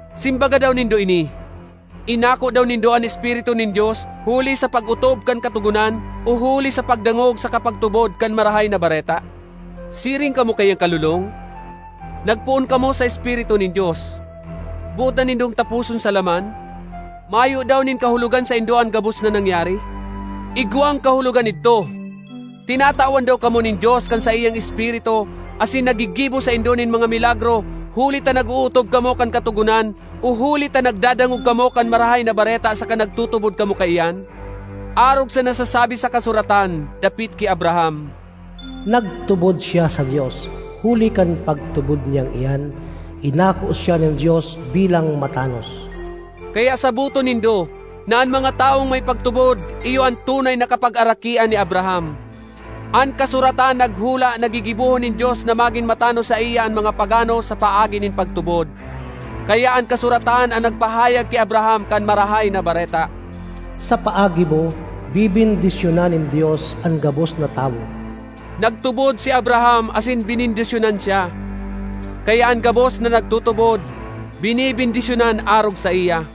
Simbaga daw nindo ini: Inako daw nindo an Espiritu nin Dios huli sa pag-otob kan Katogonan o huli sa pagdangog saka pagtubod kan Marahay na Bareta? Siring kamo kaiyan kalolong? Nagpoon kamo sa Espiritu nin Dios; boot na nindong taposon sa laman? Mayo daw nin kahulogan saindo an gabos na nangyari? Igwang kahulogan idto! Tinatawan daw kamo nin Dios kan saiyang Espiritu asin naggigibo saindo nin mga milagro huli ta nag-ootob kamo kan Katogonan o huli ta nagdadangog kamo kan Marahay na Bareta saka nagtutubod kamo kaiyan? Arog sa nasasabi sa kasuratan dapit ki Abraham, “Nagtubod siya sa Dios; huli kan pagtubod niyang iyan, inako siya nin Dios bilang matanos.” Kaya saboton nindo na an mga tawong may pagtubod iyo an tunay na kapagarakian ni Abraham. An kasuratan naghula na gigibohon nin Dios na magin matanos saiya an mga pagano sa paagi nin pagtubod. Kaya an kasuratan an nagpahayag ki Abraham kan Marahay na Bareta: “Sa paagi mo, bebendisyonan nin Dios an gabos na tawo.” Nagtubod si Abraham asin benendisyonan siya; kaya an gabos na nagtutubod, benebendisyonan arog saiya.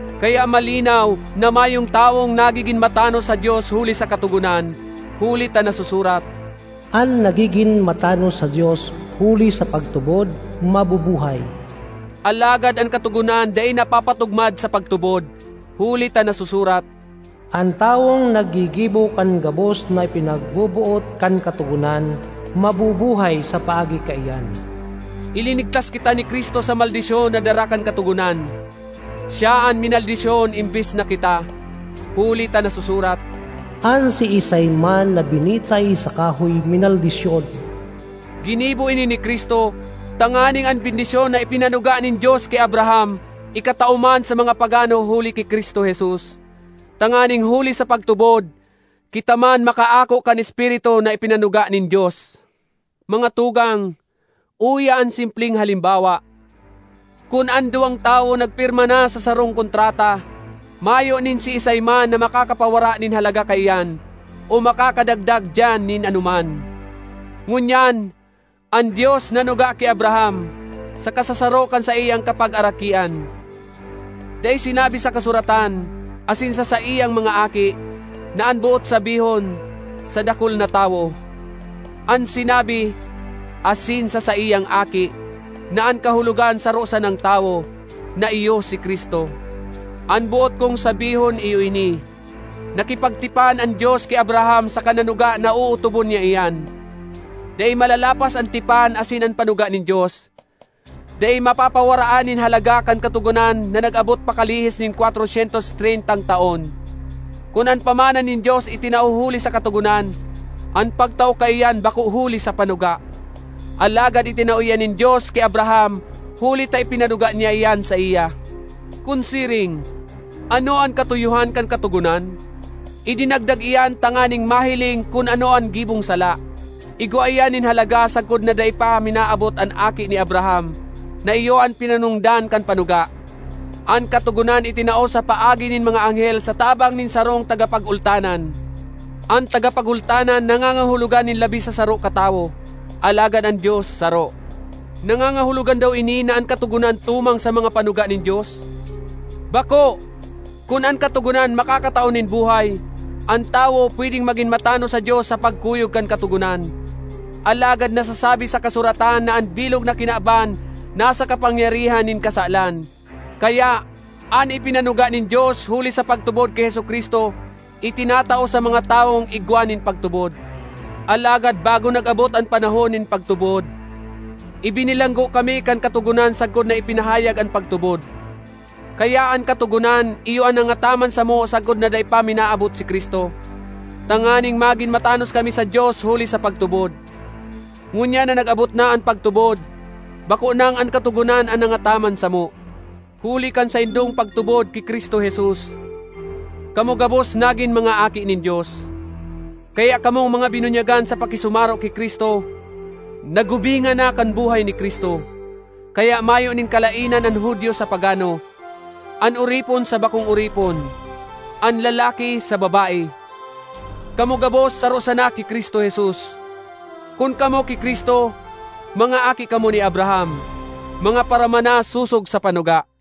Kaya malinaw na mayong tawong nagigin matanos sa Dios huli sa Katogonan. Huli ta nasusurat, “An nagigin matanos sa Dios huli sa pagtubod, mabubuhay.” Alagad an Katogonan dai napapatugmad sa pagtubod, huli ta nasusurat, “An tawong naggigibo kan gabos na ipinagboboot kan Katogonan, mabubuhay sa paagi kaiyan.” Ilinigtas kita ni Cristo sa maldisyon na dara kan Katogonan. Siya an minaldisyon embes na kita, huli ta nasusurat, “An siisay man na binitay sa kahoy minaldisyon.” Ginibo ini ni Cristo tanganing an bendisyon na ipinanuga nin Dios ki Abraham ikatao man sa mga pagano huli ki Cristo Jesus; tanganing huli sa pagtubod, kita man makaako kan Espiritu na ipinanuga nin Dios. Mga tugang, uya an simpleng halimbawa: kun an duwang tawo nagpirma na sa sarong kontrata, mayo nin siisay man na makakapawara nin halaga kaiyan o makakadagdag diyan nin anoman. Ngunyan, an Dios nanuga ki Abraham, saka sa saro kan saiyang kapagarakian. Dai sinabi sa kasuratan, “asin sa saiyang mga aki,” na an boot sabihon, sa dakul na tawo. An sinabi, “asin sa saiyang aki,” na an kahulogan saro sanang tawo, na iyo si Cristo. An boot kong sabihon iyo ini: Nakipagtipan an Dios ki Abraham saka nanuga na ootobon niya iyan. Dai malalapas an tipan asin an panuga nin Dios; dai mapapawaraan nin halaga kan Katogonan na nag-abot pakalihis nin kwatro syentos treyntang taon. Kun an pamana nin Dios itinao huli sa Katogonan, an pagtao kaiyan bako huli sa panuga. Alagad itinao iyan nin Dios ki Abraham huli ta ipinanuga niya iyan saiya. Kun siring, ano an katuyohan kan Katogonan? Idinagdag iyan tanganing mahiling kun ano an gibong sala; igwa iyan nin halaga sagkod na dai pa minaabot an aki ni Abraham na iyo an pinanongdan kan panuga. An Katogonan itinao sa paagi nin mga anghel sa tabang nin sarong tagapagultanan. An tagapagultanan nangangahulogan nin labi sa saro katawo; alagad an Dios saro. Nangangahulogan daw ini na an Katogonan tumang sa mga panuga nin Dios? Bako! Kun an katogonan makakatao nin buhay, an tawo pwedeng magin matanos sa Dios sa pagkuyog kan katogonan. Alagad nasasabi sa kasuratan na an bilog na kinaban nasa kapangyarihan nin kasalan; kaya, an ipinanuga nin Dios huli sa pagtubod ki Jesu-Cristo, itinatao sa mga tawong igwa nin pagtubod. Alagad bago nag-abot an panahon nin pagtubod, ibinilanggo kami kan Katogonan sagkod na ipinahayag an pagtubod. Kaya an Katogonan iyo an nangataman samo sagkod na dai pa minaabot si Cristo, tanganing magin matanos kami sa Dios huli sa pagtubod. Ngunyan na nag-abot na an pagtubod, bako nang an Katogonan an nangataman samo. Huli kan saindong pagtubod ki Cristo Jesus, kamo gabos nagin mga aki nin Dios. Kaya kamong mga binunyagan sa pakisumaro ki Cristo, nagubingan na kan buhay ni Cristo. Kaya mayo nin kalaenan an Judio sa pagano, an oripon sa bakong oripon, an lalaki sa babae; kamo gabos saro sana ki Cristo Jesus. Kun kamo ki Cristo, mga aki kamo ni Abraham, mga paramana sosog sa panuga.